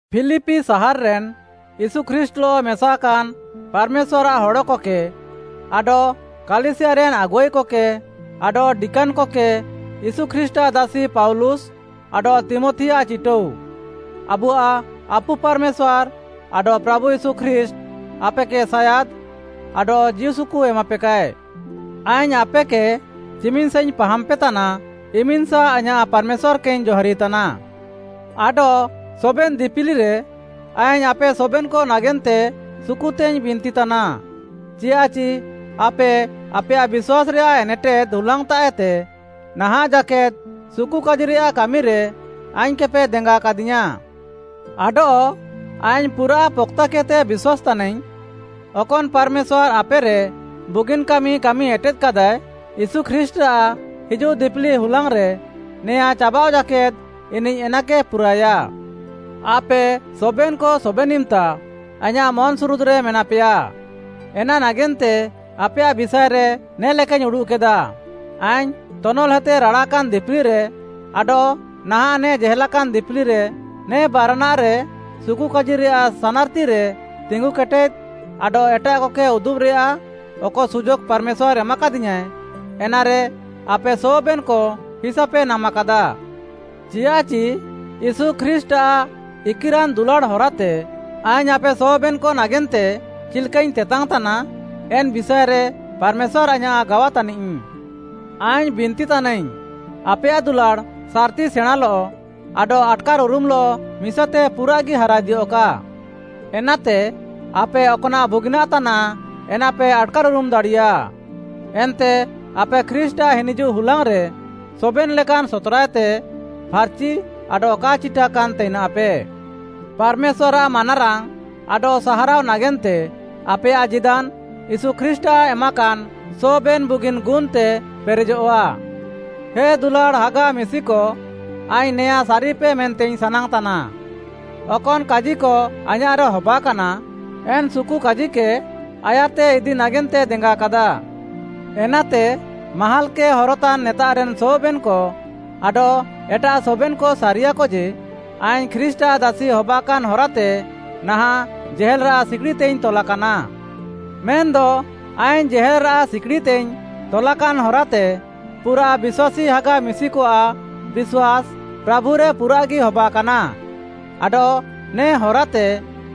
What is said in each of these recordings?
ଫିଲିପି ସାହାର୍‌ରେନ୍‌ ୟୀଶୁ ଖ୍ରୀଷ୍ଟ୍‌ଲଃ ମେସାକାନ୍‌ ପାର୍‌ମେଶ୍ୱାର୍‌ଆଃ ହଡ଼କକେ, ଆଡଃ କାଲିସିୟାରେନ୍‌ ଆଗୁଆଇକକେ, ଆଡଃ ଡିକାନ୍‌କକେ ୟୀଶୁ ଖ୍ରୀଷ୍ଟ୍‌ଆଃ ଦାସି ପାଉଲୁସ୍‌ ଆଡଃ ତୀମଥିଆଃ ଚିଟାଉ, ଆବୁଆଃ ଆପୁ ପାର୍‌ମେଶ୍ୱାର୍‌ ଆଡଃ ପ୍ରାଭୁ ୟୀଶୁ ଖ୍ରୀଷ୍ଟ୍‌ ଆପେକେ ସାୟାଦ୍‌ ଆଡଃ ଜୀଉସୁକୁ ଏମାପେକାଏ। ଆଇଙ୍ଗ୍‌ ଆପେକେ ଚିମିନ୍‌ସାଇଙ୍ଗ୍‌ ପାହାମ୍‌ପେତାନା, ଇମିନ୍‌ସା ଆଇଁୟାଃ ପାର୍‌ମେଶ୍ୱାର୍‌କେଇଙ୍ଗ୍‌ ଜହାରିତାନା। ଆଡଃ ସବେନ୍‌ ଦିପିଲିରେ ଆଇଙ୍ଗ୍‌ ଆପେ ସବେନ୍‌କ ନାଗେନ୍ତେ ସୁକୁତେଇଙ୍ଗ୍‌ ବିନ୍ତିତାନା, ଚିଆଃଚି ଆପେ ଆପେୟାଃ ବିଶ୍ୱାସ୍‌ରେୟାଃ ଏନେଟେଦ୍‌ ହୁଲାଙ୍ଗ୍‌ତାଃଏତେ ନାହାଁଃ ଜାକେଦ୍‌ ସୁକୁକାଜିରେୟାଃ କାମିରେ ଆଇଙ୍ଗ୍‌କେପେ ଦେଙ୍ଗାକାଦିୟାଁ। ଆଡଃ ଆଇଙ୍ଗ୍‌ ପୁରାଃ ପକ୍‌ତାକେଦ୍‌ତେ ବିଶ୍ୱାସ୍‌ ତାନାଇଙ୍ଗ୍‌, ଅକନ୍‌ ପାର୍‌ମେଶ୍ୱାର୍‌ ଆପେରେ ବୁଗିନ୍‌ କାମି କାମି ଏଟେଦ୍‌କାଦାଏ, ୟୀଶୁ ଖ୍ରୀଷ୍ଟ୍‌ରାଃ ହିଜୁଃଦିପିଲି ହୁଲାଙ୍ଗ୍‌ରେ ନେଆଁ ଚାବାଃଅ ଜାକେଦ୍‌ ଇନିଃ ଏନାକେ ପୁରାଏୟା। ଆପେ ସବେନ୍‌କ ସବେନ୍‌ ଇମ୍‌ତା ଆଇଁୟାଃ ମନ୍‌ସୁରୁଦ୍‌ରେ ମେନାପେୟା, ଏନା ନାଗେନ୍ତେ ଆପେୟାଃ ବିଷାଏରେ ନେ'ଲେକାଇଙ୍ଗ୍‌ ଉଡ଼ୁଃକେଦା। ଆଇଙ୍ଗ୍‌ ତନଲ୍‌ହେତେ ରାଡ଼ାକାନ୍‌ ଦିପିଲିରେ ଆଡଃ ନାହାଁଃ ନେ ଜେହେଲାକାନ୍‌ ଦିପିଲିରେ, ନେ ବାରାନାଃରେ ସୁକୁକାଜିରେୟାଃ ସାନାର୍‌ତିରେ ତିଙ୍ଗୁକେଟେଦ୍‌ ଆଡଃ ଏଟାଃକକେ ଉଦୁବ୍‌ରେୟାଃ ଅକ ସୁଯୋଗ୍‌ ପାର୍‌ମେଶ୍ୱାର୍‌ ଏମାକାଦିୟାଁଏ, ଏନାରେ ଆପେ ସବେନ୍‌କ ହିସାପେ ନାମାକାଦା। ଚିଆଃଚି ୟୀଶୁ ଖ୍ରୀଷ୍ଟ୍‌ଆଃ ଇକିରାନ୍‌ ଦୁଲାଡ଼୍‌ ହରାତେ ଆଇଙ୍ଗ୍‌ ଆପେ ସବେନ୍‌କ ନାଗେନ୍ତେ ଚିଲ୍‌କାଇଙ୍ଗ୍‌ ତେତାଙ୍ଗ୍‌ ତାନା, ଏନ୍‌ ବିଷାଏରେ ପାର୍‌ମେଶ୍ୱାର୍‌ ଆଇଁୟାଃ ଗାୱା ତାନିଃ। ଆଇଙ୍ଗ୍‌ ବିନ୍ତିତାନାଇଙ୍ଗ୍‌, ଆପେୟାଃ ଦୁଲାଡ଼୍‌ ସାର୍‌ତି ସେଣାଁଲଃ ଆଡଃ ଆଟ୍‌କାର୍‌ଉରୁମଃଲଃ ମିସାତେ ପୁରାଃଗି ହାରାଇଦିୟଃକା। ଏନାତେ ଆପେ ଅକ୍‌ନାଃ ବୁଗିନାଃ ତାନାଃ ଏନାପେ ଆଟ୍‌କାର୍‌ଉରୁମ୍‌ ଦାଡ଼ିୟା। ଏନ୍ତେ ଆପେ ଖ୍ରୀଷ୍ଟ୍‌ଆଃ ହିନିଜୁଃ ହୁଲାଙ୍ଗ୍‌ରେ ସବେନ୍‌ ଲେକାନ୍‌ ସତ୍‌ରାଏତେ ଫାର୍‌ଚି ଆଡଃ କା ଚିଟାକାନ୍‌ ତାଇନାଃପେ। ପାର୍‌ମେଶ୍ୱାର୍‌ଆଃ ମାନାରାଙ୍ଗ୍‌ ଆଡଃ ସାହାରାଅ ନାଗେନ୍ତେ ଆପେୟାଃ ଜୀଦାନ୍‌ ୟୀଶୁ ଖ୍ରୀଷ୍ଟ୍‌ଆଃ ଏମାକାନ୍‌ ସବେନ୍‌ ବୁଗିନ୍‌ ଗୁନ୍‌ତେ ପେରେଜଃଆ। ହେ ଦୁଲାଡ଼୍‌ ହାଗା ମିଶିକ, ଆଇଙ୍ଗ୍‌ ନେଆଁ ସାରିପେ ମେନ୍ତେଇଙ୍ଗ୍‌ ସାନାଙ୍ଗ୍‌ତାନା, ଅକନ୍‌ କାଜିକ ଆଇଁୟାଃରେ ହବାକାନା, ଏନା ସୁକୁକାଜିକେ ଆୟାର୍‌ତେ ଇଦି ନାଗେନ୍ତେ ଦେଙ୍ଗାକାଦା। ଏନାତେ, ମାହାଲ୍‌କେ ହରତାନ୍‌ ନେତାଃରେନ୍‌ ସବେନ୍‌କ ଆଡଃ ଏଟାଃ ସବେନ୍‌କ ସାରିୟାଃକ ଯେ, ଆଇଙ୍ଗ୍‌ ଖ୍ରୀଷ୍ଟ୍‌ଆଃ ଦାସି ହବାକାନ୍‌ ହରାତେ ନାହାଁଃ ଜେହେଲ୍‌ରାଃ ସିକିଡ଼ିତେଇଙ୍ଗ୍‌ ତଲାକାନା। ମେନ୍‌ଦ ଆଇଙ୍ଗ୍‌ ଜେହେଲ୍‌ରାଃ ସିକିଡ଼ିତେଇଙ୍ଗ୍‌ ତଲାକାନ୍‌ ହରାତେ ପୁରାଃ ବିଶ୍ୱାସୀ ହାଗା ମିଶିକଆଃ ବିଶ୍ୱାସ୍‌ ପ୍ରାଭୁରେ ପୁରାଃଗି ହବାକାନା, ଆଡଃ ନେ ହରାତେ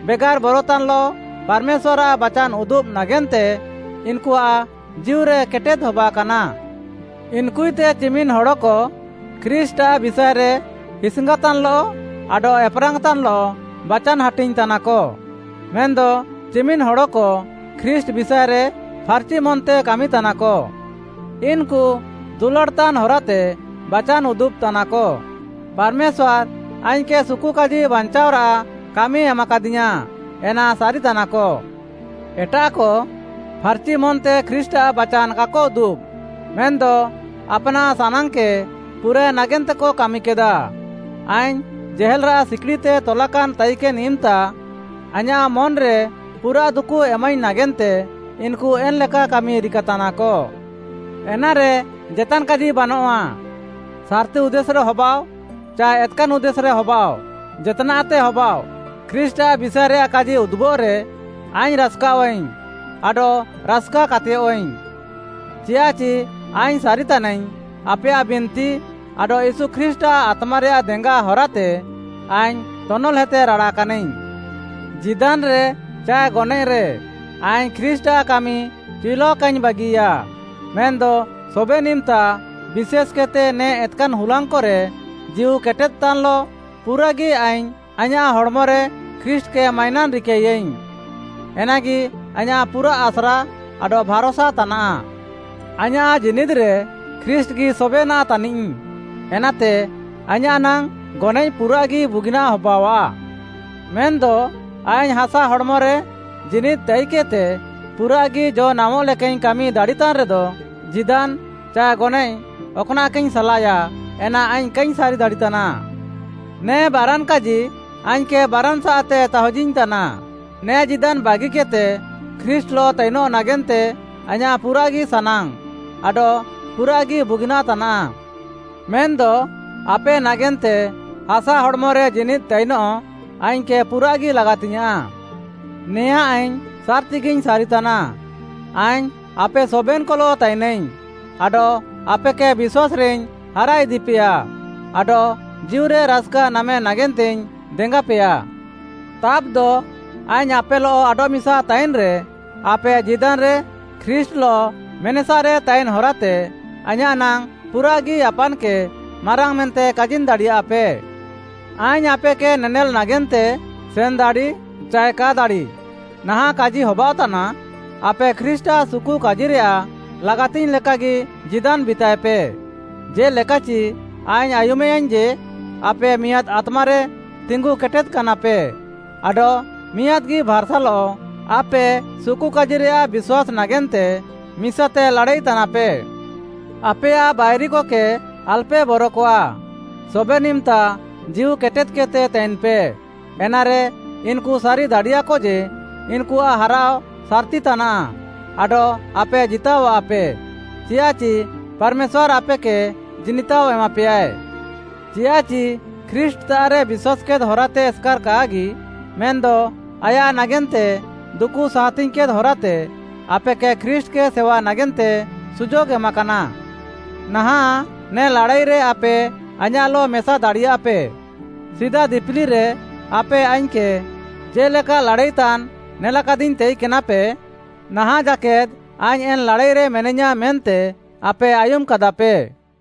ବେଗାର୍‌ ବରତାନ୍‌ଲଃ ପାର୍‌ମେଶ୍ୱାର୍‌ଆଃ ବାଚାନ୍‌ ଉଦୁବ୍‌ ନାଗେନ୍ତେ ଇନ୍‌କୁଆଃ ଜୀଉରେ କେଟେଦ୍‌ ହବାକାନା। ଇନ୍‌କୁଏତେ ଚିମିନ୍‌ ହଡ଼କ ଖ୍ରୀଷ୍ଟ୍‌ଆଃ ବିଷାଏରେ ହିସ୍‌ଙ୍ଗାତାନ୍‌ଲଃ ଆଡଃ ଏପେରାଙ୍ଗ୍‌ତାନ୍‌ଲଃ ବାଚାନ୍‌ ହାଟିଙ୍ଗ୍‌ତାନାକ, ମେନ୍‌ଦ ଚିମିନ୍‌ ହଡ଼କ ଖ୍ରୀଷ୍ଟ୍‌ ବିଷାଏରେ ଫାର୍‌ଚି ମନ୍‌ତେ କାମିତାନାକ। ଇନ୍‌କୁ ଦୁଲାଡ଼୍‌ତାନ୍‌ ହରାତେ ବାଚାନ୍‌ ଉଦୁବ୍‌ତାନାକ। ପାର୍‌ମେଶ୍ୱାର୍‌ ଆଇଙ୍ଗ୍‌କେ ସୁକୁକାଜି ବାଞ୍ଚାଅରାଃ କାମି ଏମାକାଦିୟାଁ, ଏନା ସାରିତାନାକ। ଏଟାଃକ ଫାର୍‌ଚିମନ୍‌ତେ ଖ୍ରୀଷ୍ଟ୍‌ଆଃ ବାଚାନ୍‌ କାକ ଉଦୁବ୍‌, ମେନ୍‌ଦ ଆପ୍‌ନାଃ ସାନାଙ୍ଗ୍‌କେ ପୁରାଏ ନାଗେନ୍ତେକ କାମିକେଦା। ଆଇଙ୍ଗ୍‌ ଜେହେଲ୍‌ରାଃ ସିକିଡ଼ିତେ ତଲାକାନ୍‌ ତାଇକେନ୍‌ ଇମ୍‌ତା ଆଇଁୟାଃ ମନ୍‌ରେ ପୁରାଃ ଦୁକୁ ଏମାଇଙ୍ଗ୍‌ ନାଗେନ୍ତେ ଇନ୍‌କୁ ଏନ୍‌ଲେକା କାମି ରିକାତାନାକ। ଏନାରେ ଜେତାନ୍‌ କାଜି ବାନଃଆ। ସାର୍‌ତି ଉଦ୍ଦେଶ୍‌ରେ ହବାଃଅ ଚାଏ ଏତ୍‌କାନ୍‌ ଉଦ୍ଦେଶ୍‌ରେ ହବାଃଅ, ଜେତ୍‌ନାଃତେ ହବାଃଅ, ଖ୍ରୀଷ୍ଟ୍‌ଆଃ ବିଷାଏରେୟାଃ କାଜି ଉଦୁବଃରେ, ଆଇଙ୍ଗ୍‌ ରାସ୍‌କାଃଅଇଙ୍ଗ୍‌ ଆଡଃ ରାସ୍‌କା କାତେୟଃଇଙ୍ଗ୍‌, ଚିଆଃଚି ଆଇଙ୍ଗ୍‌ ସାରିତାନାଇଙ୍ଗ୍‌ ଆପେୟାଃ ବିନ୍ତି ଆଡଃ ୟୀଶୁ ଖ୍ରୀଷ୍ଟ୍‌ଆଃ ଆତ୍ମାରେୟାଃ ଦେଙ୍ଗା ହରାତେ ଆଇଙ୍ଗ୍‌ ତନଲ୍‌ହେତେ ରାଡ଼ାକାନାଇଙ୍ଗ୍‌। ଜୀଦାନ୍‌ରେ ଚାଏ ଗନଏଃରେ ଆଇଙ୍ଗ୍‌ ଖ୍ରୀଷ୍ଟ୍‌ଆଃ କାମି ଚିଉଲାଅ କାଇଙ୍ଗ୍‌ ବାଗିୟା। ମେନ୍‌ଦ ସବେନ୍‌ ଇମ୍‌ତା ବିଶେଷ୍‌କେଦ୍‌ତେ ନେ ଏତ୍‌କାନ୍‌ ହୁଲାଙ୍ଗ୍‌କରେ ଜୀଉ କେଟେଦ୍‌ତାନ୍‌ଲଃ ପୁରାଗି ଆଇଙ୍ଗ୍‌ ଆଇଁୟାଃ ହଡ଼୍‌ମରେ ଖ୍ରୀଷ୍ଟ୍‌କେ ମାଇନାନ୍‌ ରିକାୟାଇଙ୍ଗ୍‌, ଏନାଗି ଆଇଁୟାଃ ପୁରାଃ ଆସ୍ରା ଆଡଃ ଭାର୍‌ସା ତାନାଃ। ଆଇଁୟାଃ ଜୀନିଦ୍‌ରେ ଖ୍ରୀଷ୍ଟ୍‌ଗି ସବେନାଃ ତାନିଃ। ଏନାତେ ଆଇଁୟାଃ ନାଙ୍ଗ୍‌ ଗନଏଃ ପୁରାଃଗି ବୁଗିନାଃ ହବାଅଃଆ। ମେନ୍‌ଦ ଆଇଙ୍ଗ୍‌ ହାସା ହଡ଼୍‌ମରେ ଜୀନିଦ୍‌ ତାଇକେଦ୍‌ତେ ପୁରାଃଗି ଜ'ନାମଃ ଲେକାଇଙ୍ଗ୍‌ କାମି ଦାଡ଼ିତାନ୍‌ରେଦ, ଜୀଦାନ୍‌ ଚାଏ ଗନଏଃ ଅକ୍‌ନାଃକେଇଙ୍ଗ୍‌ ସାଲାଏୟା ଏନା ଆଇଙ୍ଗ୍‌ କାଇଙ୍ଗ୍‌ ସାରିଦାଡ଼ିତାନା। ନେ ବାରାନ୍‌ କାଜି ଆଇଙ୍ଗ୍‌କେ ବାରାନ୍‌ସାଃତେ ତାହୁଜିଇଙ୍ଗ୍‌ତାନା। ନେ ଜୀଦାନ୍‌ ବାଗିକେଦ୍‌ତେ ଖ୍ରୀଷ୍ଟ୍‌ଲଃ ତାଇନଃ ନାଗେନ୍ତେ ଆଇଁୟାଃ ପୁରାଃଗି ସାନାଙ୍ଗ୍‌ ଆଡଃ ପୁରାଃଗି ବୁଗିନାଃ ତାନାଃ। ମେନ୍‌ଦ ଆପେ ନାଗେନ୍ତେ ହାସା ହଡ଼୍‌ମରେ ଜୀନିଦ୍‌ ତାଇନଃ ଆଇଙ୍ଗ୍‌କେ ପୁରାଃଗି ଲାଗାତିଙ୍ଗ୍‌ୟାଁଃ। ନେଆଁ ଆଇଙ୍ଗ୍‌ ସାର୍‌ତିଗିଙ୍ଗ୍‌ ସାରିତାନା, ଆଇଙ୍ଗ୍‌ ଆପେ ସବେନ୍‌କଲଃ ତାଇନାଇଙ୍ଗ୍‌, ଆଡଃ ଆପେକେ ବିଶ୍ୱାସ୍‌ରେଇଙ୍ଗ୍‌ ହାରାଇଦିପେୟା ଆଡଃ ଜୀଉରେ ରାସ୍‌କା ନାମେ ନାଗେନ୍ତେଇଙ୍ଗ୍‌ ଦେଙ୍ଗାପେୟା। ତାବ୍‌ଦ, ଆଇଙ୍ଗ୍‌ ଆପେଲଃ ଆଡଃମିସା ତାଇନ୍‌ରେ, ଆପେ ଜୀଦାନ୍‌ରେ ଖ୍ରୀଷ୍ଟ୍‌ଲଃ ମେନେସାରେ ତାଇନ୍‌ ହରାତେ ଆଇଁୟାଃ ନାଙ୍ଗ୍‌ ପୁରାଃଗି ଆପାନ୍‌କେ ମାରାଙ୍ଗ୍‌ ମେନ୍ତେ କାଜିନ୍‌ ଦାଡ଼ିୟାଃପେ। ଆଇଙ୍ଗ୍‌ ଆପେକେ ନେନେଲ୍‌ ନାଗେନ୍ତେ ସେନ୍‌ ଦାଡ଼ି ଚାଏ କା ଦାଡ଼ି, ନାହାଁଃ କାଜି ହବାଅଃତାନା, ଆପେ ଖ୍ରୀଷ୍ଟ୍‌ଆଃ ସୁକୁକାଜିରେୟାଃ ଲାଗାତିଙ୍ଗ୍‌ ଲେକାଗି ଜୀଦାନ୍‌ ବିତାଏପେ, ଜେ'ଲେକାଚି ଆଇଙ୍ଗ୍‌ ଆୟୁମେୟାଇଙ୍ଗ୍‌ ଯେ ଆପେ ମିଆଁଦ୍‌ ଆତ୍ମାରେ ତିଙ୍ଗୁ କେଟେଦ୍‌କାନାପେ ଆଡଃ ମିଆଁଦ୍‌ଗି ଭାର୍‌ସାଲଃ ଆପେ ସୁକୁକାଜିରେୟାଃ ବିଶ୍ୱାସ୍‌ ନାଗେନ୍ତେ ମିସାତେ ଲାଡ଼ାଇତାନାପେ। ଆପେୟାଃ ବାଇରିକକେ ଆଲପେ ବରକଆ, ସବେନ୍‌ ଇମ୍‌ତା ଜୀଉ କେଟେଦ୍‌କେଦ୍‌ତେ ତାଇନ୍‌ପେ। ଏନାରେ, ଇନ୍‌କୁ ସାରି ଦାଡ଼ିୟାକ ଯେ, ଇନ୍‌କୁଆଃ ହାରାଅ ସାର୍‌ତି ତାନାଃ ଆଡଃ ଆପେ ଜିତାଅଃୱାପେ, ଚିଆଃଚି ପାର୍‌ମେଶ୍ୱାର୍‌ ଆପେକେ ଜିନିତାଅ ଏମାପେୟାଏ। ଚିଆଃଚି ଖ୍ରୀଷ୍ଟ୍‌ତାଃରେ ବିଶ୍ୱାସ୍‌କେଦ୍‌ ହରାତେ ଏସ୍‌କାର୍‌ କାଗି, ମେନ୍‌ଦ ଆୟାଃ ନାଗେନ୍ତେ ଦୁକୁ ସାହାତିଙ୍ଗ୍‌କେଦ୍‌ ହରାତେ ଆପେକେ ଖ୍ରୀଷ୍ଟ୍‌କେ ସେୱା ନାଗେନ୍ତେ ସୁଯୋଗ୍‌ ଏମାକାନା। ନାହାଁଃ ନେ ଲାଡ଼ାଇରେ ଆପେ ଆଇଁୟାଃଲଃ ମେସା ଦାଡ଼ିୟଃଆପେ। ସିଦା ଦିପିଲିରେ ଆପେ ଆଇଙ୍ଗ୍‌କେ ଜେ'ଲେକା ଲାଡ଼ାଇତାନ୍‌ ନେଲାକାଦିଙ୍ଗ୍‌ ତାଇକେନାପେ, ନାହାଁଃ ଜାକେଦ୍‌ ଆଇଙ୍ଗ୍‌ ଏନ୍‌ ଲାଡ଼ାଇରେ ମେନାଇୟାଁ ମେନ୍ତେ ଆପେ ଆୟୁମ୍‌କାଦାପେ।